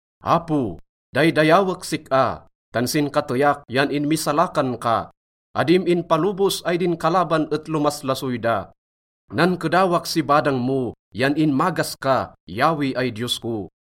Apo, daydayawek sik-a, tan sin kateyak yan inmisalakan ka. Adim inpalobos ay din kalaban et lomaslasoy da. Nankedawak si badang mo yan inmagas ka, Yahweh ay Diyos ko.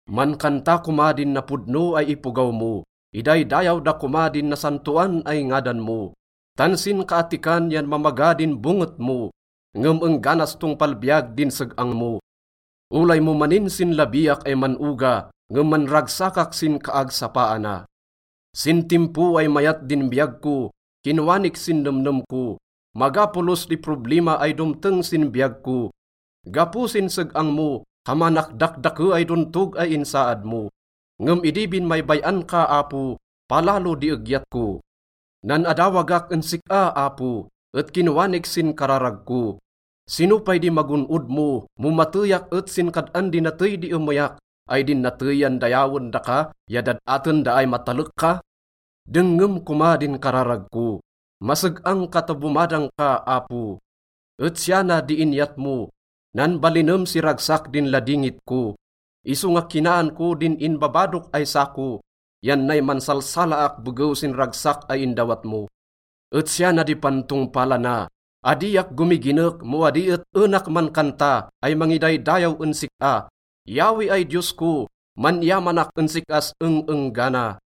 Mankanta koma din napodno ay ipogaw mo, idaydayaw da koma din nasantoan ay ngadan mo. Tan sinkaattikan yan mamaga din bonget mo, ngem engganas tongpal biyag din seg-ang mo. Olay mo maninsinlabiak ay man-oga, ngem manragsakak sin kaagsapaana. Sin timpo ay mayat din biyag ko, kinwanik sin nemnem ko, “Maga polos di problima ay domteng sin biyag ko.” Gapo sin seg-ang mo, kamanak dakdake ay dontog ay insaad mo. Ngem idi binmaybay-an ka, Apo, palalo di egyat ko. Nan-adawagak en sik-a, Apo, et kinwanik sin kararag ko, “Sino pay di magon-od mo, mo mateyak et sin kad-an di natey di emeyak? Ay din natey yan dayawen daka ya dad-aten da ay matalek ka? Dengngem koma din kararag ko, maseg-ang ka ta bomadang ka, Apo.” Et siya na di inyat mo, nanbalinem si ragsak din ladingit ko, isonga kinaan ko din inbabadok ay sako yan nay mansalsalaak begew sin ragsak ay indawat mo. Et siya na di pantongpalana, adiak gomiginek mo adi et enak mankanta ay mangidaydayaw en sik-a. Yahweh ay Diyos ko, man-iyamanak en sik-as eng-enggana.